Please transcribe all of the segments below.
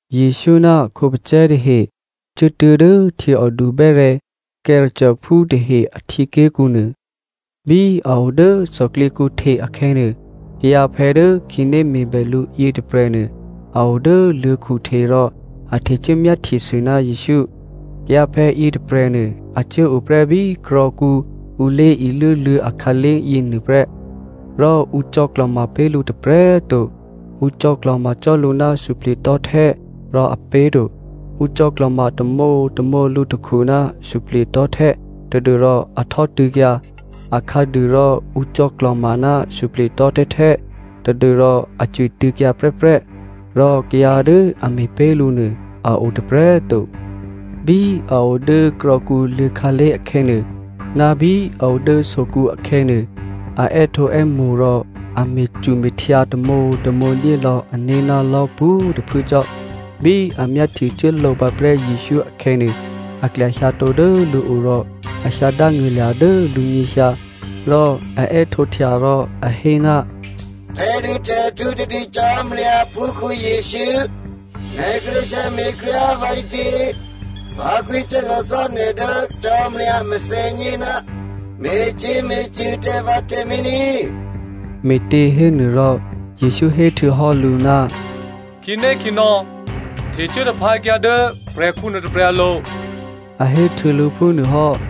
Jesǔ ná a khǒpacè̤̌ tahe cuốtuố̤ dố htyěòdu bè́rè̤̌ Gerasenephú tahe a htyěké̤kǔ nuô. Bí a o dố thòklyěkǔ hte akhè̌nuô, kayǎphè̌ dố khǐné me̤bè lǔ yětôprè̤nuô a o dố luô̤̌khu hte rò a htecuố myáhtyesû ná Jesǔ. Kayǎphè̌ yětôprè̤nuô a cuốo prè́ bí krò̌kǔ ǔ lé̤iluố luô̤̌ akhǎlé̤ yěnuô prè́. Rò ǔ cò̌klò̤ma pé̤ lǔ tôprè̤꤮ to, ǔ cò̌klò̤ma cò́ lǔ ná suplye̤tò̤́htè́ rò a pé̤to. Ǔ cò̌klò̤ma tamǒtamǒ lǔtakhu ná suplye̤tò̤́htè́ tadû́rò a htò́tû̌kyǎ. Akhǎduô rò ǔ cò̌klò̤ma ná suplye̤tò̤́htè́htè́, tadû́rò a cwitû̌kyǎ prè́prè́. Rò kayǎ dố a me̤pé̤ lǔ nuô, a o tôprè̤꤮ to. Bí a o dố krò̌kǔ luô̤̌khǎlé̤ akhè̌nuô, ná bí a o dố sokǔ akhè̌nuô, a è́htǒè́mo̤ rò a me̤cume̤htyǎ tamǒtamǒ ní̤dyé lò̌ ané̤ ná lò̤́ pwǒ̤꤮ tôphuố cò́. Bí a myáhtyecuốlǒ pǎprè́ Jesǔ akhè̌nuô, a klyahyǎtǒ dố lǔo rò a hyǎ dángṳ̂lya̤ dố lǔnyěhyǎ. Rò a è́htǒhtya rò a hé, “Tè̤dutè̤htǔ tadû Cò́marya aphúkhǔ Jesǔ꤮ nè̤ kíré̤ hyǎme̤ kryá꤮ vǎ ǐtě? Vǎ kwǐthè́zò̤ cò́ nè̤ dố Cò́marya a mèthènyě, me̤cyě̤me̤cṳ̂ tǎ vǎ tǎmé̤ ní꤮.” Me̤těhénuôrò Jesǔ héhtuô̌hò́ lǔ, “Khǐnékhǐnò̌, htecuố taphǎkyǎ dố prè̤khǔ nuôtôprè̤ alo̤,” a héhtuô̌ lǔ phúnuô hò́.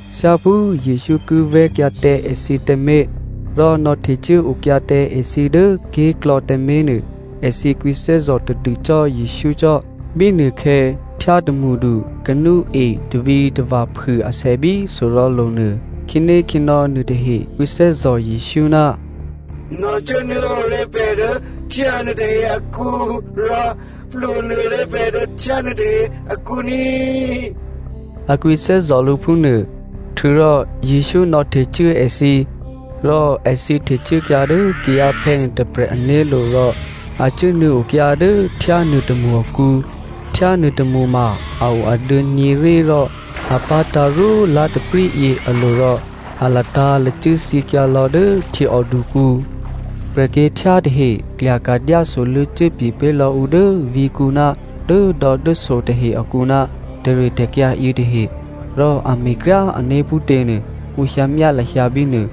Thyáphú Jesǔ ki vè̤́kyǎ tǎ èthǐ tǎmé̤, rò nò̌htecuốokyǎ tǎ èthǐ dố ké̤klò̌ tǎmé̤nuô, èthǐ kwǐthè́zò̤ tadû cò́ Jesǔ cò́. Bínuôkhè̌, htyá tômṳdu kanúe tavǐtava̤phû asè bí sorò̤̌lo̤nuô. Khǐnékhǐnò̌ nuôtahe kwǐthè́zò̤ Jesǔ, “Nò̌cuốnuô̌o ré̤ pè̤ dố htyá nuôtahe akǔ rò plwǒnuô̌ ré̤ pè̤ dố htyá nuôtahe akǔ ní,” a kwǐthè́zò̤ lǔ phúnuô. Htuô̌rò Jesǔ nò̌htecuố èthǐ, rò èthǐ htecuốkyǎ dố kayǎphè̌ nuôtôprè̤ ané̤lo̤ rò a cuốnuô̌okyǎ dố htyá nuôtômṳ akǔ. Htyá nuôtômṳ ma a o aduô̌nyě̤rí rò a pá̤tǎ̤ rwó lá̤taprǐ yě alo̤ rò a latǎ̤lacû́ thyěkyǎ lò̌ dố htyěòdukǔ. Prè̤kyě̤htyá tahe klyaka̤ dyásoluô̌ cuốpye̤ pé̤lò̌ ǔ dố vǐ̤kǔ ná dốdò̌dốso tahe akǔ ná tè̤ritè̤kyǎ yětahe. Rò a me̤kryáané̤ phútěnuô ǔ hyǎmyá lahyǎ bínuô.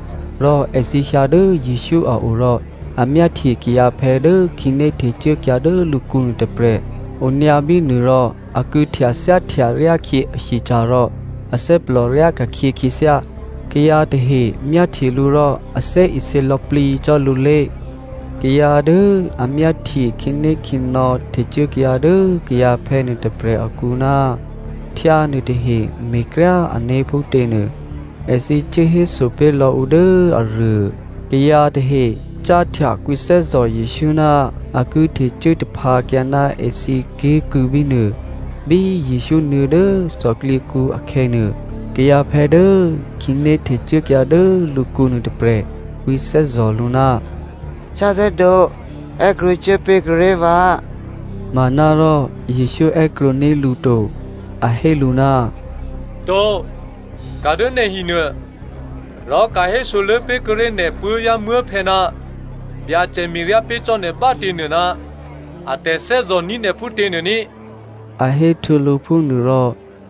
Rò èthǐ hyǎ dố Jesǔ a o rò a myáhtye kayǎphè̌ dố khǐné htecuốkyǎ dố lǔkǔ nuôtôprè̤ onyǎ bínuô rò a kû̌htyathyáhtya ryákhyě ahyeca̤ rò athè́plò ryáka̤khyě khyěthyá. Kayǎ tahe myáhtye lǔ rò a thè́isě lò̌plǐ cò́ lǔlé̤. Kayǎ dố a myáhtye khǐnékhǐnò̌ htecuốkyǎ dố kayǎphè̌ nuôtôprè̤ akǔ ná htyá nuôtahe me̤kryá ané̤ phútě nuô, èthǐ cuố héso pé̤ lò̌ǔ dố aruô. Kayǎ tahe cáhtya kwǐthè́zò̤ Jesǔ ná a ki htecuố taphǎkyǎ ná èthǐ ké̤kû̌ bínuô. Bí Jesǔ nuô̌ dố thòklyěkǔ akhè̌nuô, kayǎphè̌ dố khǐné htecuốkyǎ dố lǔkǔ nuôtôprè̤ kwǐthè́zò̤ lǔ, “Khyáthè́dǒ è́krwǒcuố pé̤kuô̌ ré̤ vǎ.” Manárò Jesǔ è́krwǒní̤ lǔ to, a hé lǔ, “To, ka̤ dố nè̤ hinuô rò ka̤hésoluô̌ pé̤kuô̌ré̤ nè̤ puố̤vyá̤muố̤phè̌ ná Byacè me̤ryá pé̤ cò́ nè̤ bá꤮ těnuô ná a tè̤thè́zò̤ní̤ nè̤ phútě nuô ní꤮,” a héhtuô̌ lǔ phúnuôrò,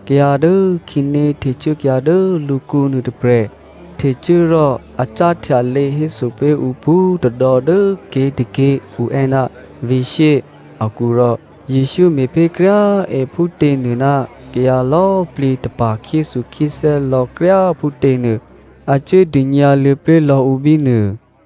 kayǎ dố khǐné htecuốkyǎ dố lǔkǔ nuôtôprè̤ htecuố rò a cáhtya lě héso pé̤ ǔ pwǒ̤tôdò̌ dố ké̤tôké̤ ǔ è́ ná “Vǐ̤ shyé” akǔ rò Jesǔ me̤pé̤ kryá꤮ è phútěnuô ná kayǎ lò̌꤮ plǐ tapa̤ khyéthukhyéthè́ lò̌ kryá꤮ phútěnuô a cuố dônyǎluô̌ pé̤ lò̌ǔ bínuô.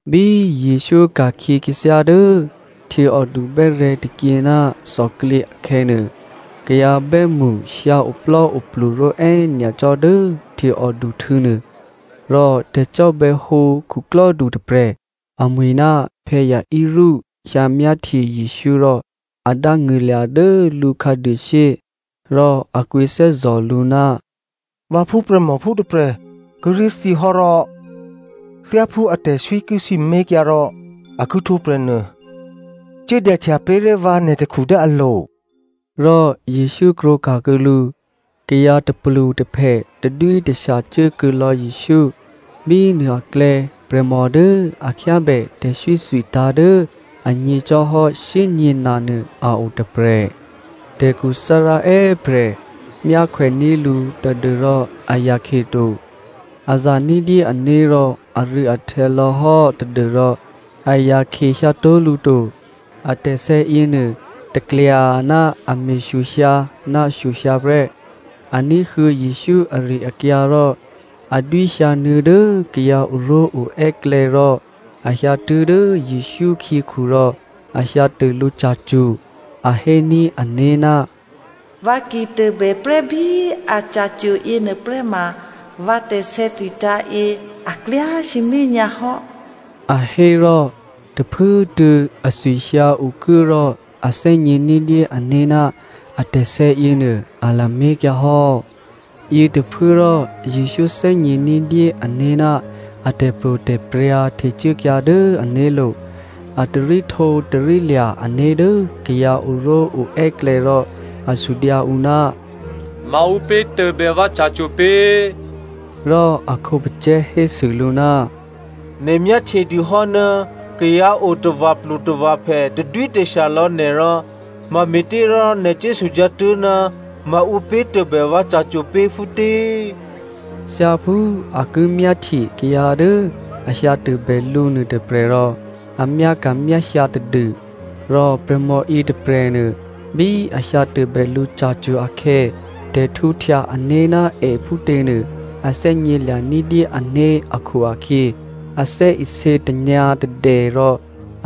Bí Jesǔ ka̤khyě khyěthyá dố htyěòdu bè́rè̤̌ tôkyě ná thòklyě akhè̌nuô, kayǎ bè́mṳ hyǎ oplò́oplu ró̤è́ nyacò́ dố htyěòdu htû̌ nuô. Rò tè̤cò́bè̌hǒ khuklò́du tôprè̤, amwi̤ ná Jairus hyǎmyáhtye Jesǔ rò a dángṳ̂lya̤ dố lǔkhǎduô shyé. Rò a kwǐthè́zò̤ lǔ, “Vǎ phúprè̤mòphú tôprè̤ kíré̤ thyěhò́ rò thyáphú atè̤swí ki sǐmé̤kyǎ rò a ki htwǒprè̤ nuô, cuố dyahtya pé̤ré̤ vǎ nè̤ takhu dố alo̤.” Rò Jesǔ krwǒka̤kuô̌ lǔ. Kayǎ tôplutôphè tadwítashya cuố kuô̌ lò̌ Jesǔ. Bínuô aklè̌ prè̤mò dố a khyábè tè̤sè̌thwitǎ̤ dố anyě̤ cò́hò́ shyényě̤na nuô a o tôprè̤. Tè̤khuthárá è́prè̤ myákhwèní̤ lǔ tadû́rò a yakhye to. A za ní̤dyé ané̤ rò arû̌ahtè̌ lò̌hò́ tadû́rò a yakhyehyǎtó̤ lǔ to, atè̤sè̌ yěnuô taklya ná a me̤shyohyǎ ná shyohyǎ prè́. A ní̤huô̌ Jesǔ ari-akyǎ rò a dwíhyǎnuô̌ dố kayǎ oró̤oè́klè̌ rò a hyǎtuố̤ dố Jesǔ khyěkhu rò a hyǎtô lǔ ca̤cwo̤. A héní̤ ané̤, “Vǎ ki tôbè prè́bí aca̤cwo̤ yěnuôprè́ ma vǎ tè̤sè̌thwitǎ̤ yě a klyá sǐmé̤ nyǎ hò́,” a hé rò, tôphuốtuô̌ athwihyǎ okuố rò a thè́gně ní̤dyé ané̤ ná atè̤sè̌ yěnuô a lamé̤kyǎhò́. Yětôphuốrò Jesǔ thè́gně ní̤dyé ané̤ ná a tè̤pro̤tè̤prya̤ htecuốkyǎ dố ané̤lo̤. A taríhtǒtarílya̤ ané̤ dố kayǎ oró̤oè́klè̌ rò, a sudyǎ ǔ, “Maǔpě tôbè vǎ ca̤cwo̤ pě?” Rò a khǒpacè̤̌ hésû lǔ, “Nè̤ myáhtyedûhò́ ná kayǎ o tava̤plutava̤phè tadwítashya lò̌ nè̤ rò mame̤těrò nè̤ cuốsudyǎ tuố̤, ‘Maǔpě tôbè vǎ ca̤cwo̤ pě phútě?’” Thyáphú a ki myáhtye kayǎ dố a hyǎ tôbè lǔ nuôtôprè̤ rò a myáka̤myáhyǎ tadû. Rò prè̤mò yětôprè̤nuô bí a hyǎtôbè lǔ ca̤cwo̤ akhè̌, tè̤htwǒhtya-ané̤ ná è phútěnuô a thè́gnělya̤ ní̤dyé ané̤ akhu-akhyě, a thè́isě tanyǎ̤tadè rò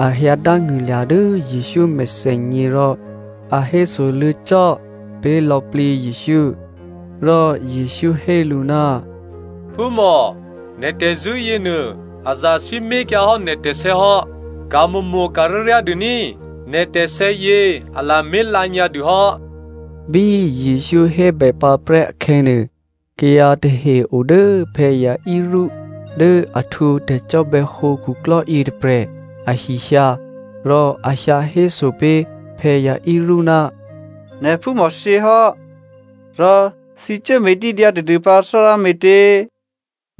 a hyǎdángṳ̂lya̤ dố Jesǔ mèthènyě rò a hésoluô̌ cò́ pé̤ lò̌plǐ Jesǔ. Rò Jesǔ hé lǔ, “Phúmò꤮, nè̤ tè̤zṳ̂́ yěnuô, a zasǐmé̤kyǎhò́ nè̤ tè̤sè̌hò́, ka̤mo̤mo̤ ka̤ryáryá dû ní꤮, nè̤ tè̤sè̌ yě a lamé̤ lǎnyǎdûhò́.” Bí Jesǔ hébèpǎprè́ akhè̌nuô, kayǎ tahe o dố Jairus dố a htwǒ tè̤cò́bè̌hǒ khuklò́ yětôprè̤ ahi hyǎ, rò a hyǎhéso pé̤ Jairus, “Nè̤phúmò thyěhò́. Rò thǐ cuốme̤dídyǎ tadûpǎ Thárá me̤tě?”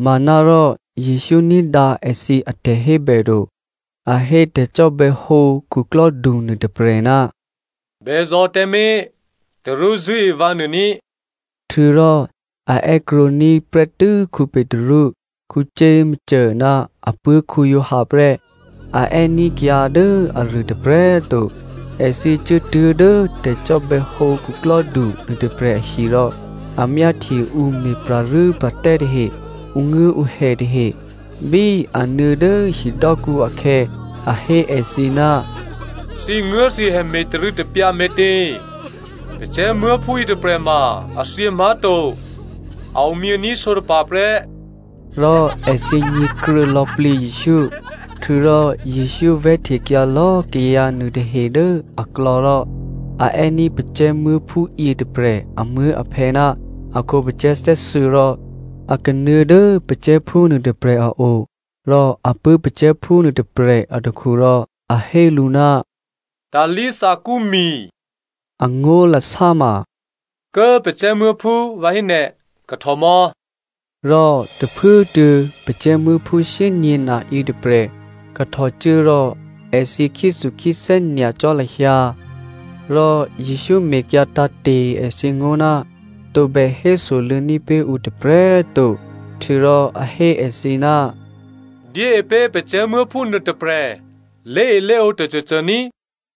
Manárò Jesǔ ní̤dǎ èthǐ atè̤hébè to. A hé tè̤cò́bè̌hǒ khuklò́du nuôtôprè̤, “Bèzò̤ tǎmé̤, tarú zṳ̂́e vǎnuô ní꤮.” Htuô̌rò a è́krwǒní̤ prè́tû́ Petru, Jakomo ná apuố̤ Giovanni prè́. A è́ní̤ kayǎ dố aruô tôprè̤꤮ to. Èthǐ cuốtuố̤ dố tè̤cò́bè̌hǒ khuklò́du nuôtôprè̤ ahi rò a myáhtye ǔ me̤pra̤rû́pra̤tè́ tahe, ǔnguố̤ǔhè tahe. Bí a nuô̌ dố hidò́kǔ akhè̌, a hé èthǐ, “Thǐnguố̤thǐhè me̤tarû̌tapyǎ me̤tě? Pacè̤̌muố̤phú yětôprè̤ma a thyě má̤to. A omyění̤ sǒtapa̤ prè́.” Rò èthǐ nyě̤kruô̌ lò̌plǐ Jesǔ. Htuô̌rò Jesǔ vè̤́htekyǎ lò̌꤮ kayǎ nuôtahe dố aklò̌ rò a è́ní̤ pacè̤̌muố̤phú yětôprè̤ amuố̤aphè̌ ná a khǒpacè̤̌ thè́thuô̌ rò a kanuô̌ dố pacè̤̌phú nuôtôprè̤ a o. Rò a pṳ̂́ pacè̤̌phú nuôtôprè̤ atakhu rò a hé lǔ, “Talí thakúmi” (Angó̤lasá ma, “Kố꤮ pacè̤̌muố̤phú꤮ vǎ hé nè̤꤮ kahtòmò̌.”), rò tôphuốtuô̌ pacè̤̌muố̤phú shyényě̤na yětôprè̤ kahtòcuố rò èthǐ khyéthukhyéthè́ nyacò́ lahyǎ. Rò Jesǔ mekyǎ tǎ̤te̤ èthǐ ngó̤, tǒbè hésoluô̌ní̤ pé̤ ǔ tôprè̤꤮ to, htuô̌rò a hé èthǐ, “Dyée pé̤ pacè̤̌muố̤phú nuôtôprè̤ lé̤elé̤ǒ tôcôcô ní꤮.”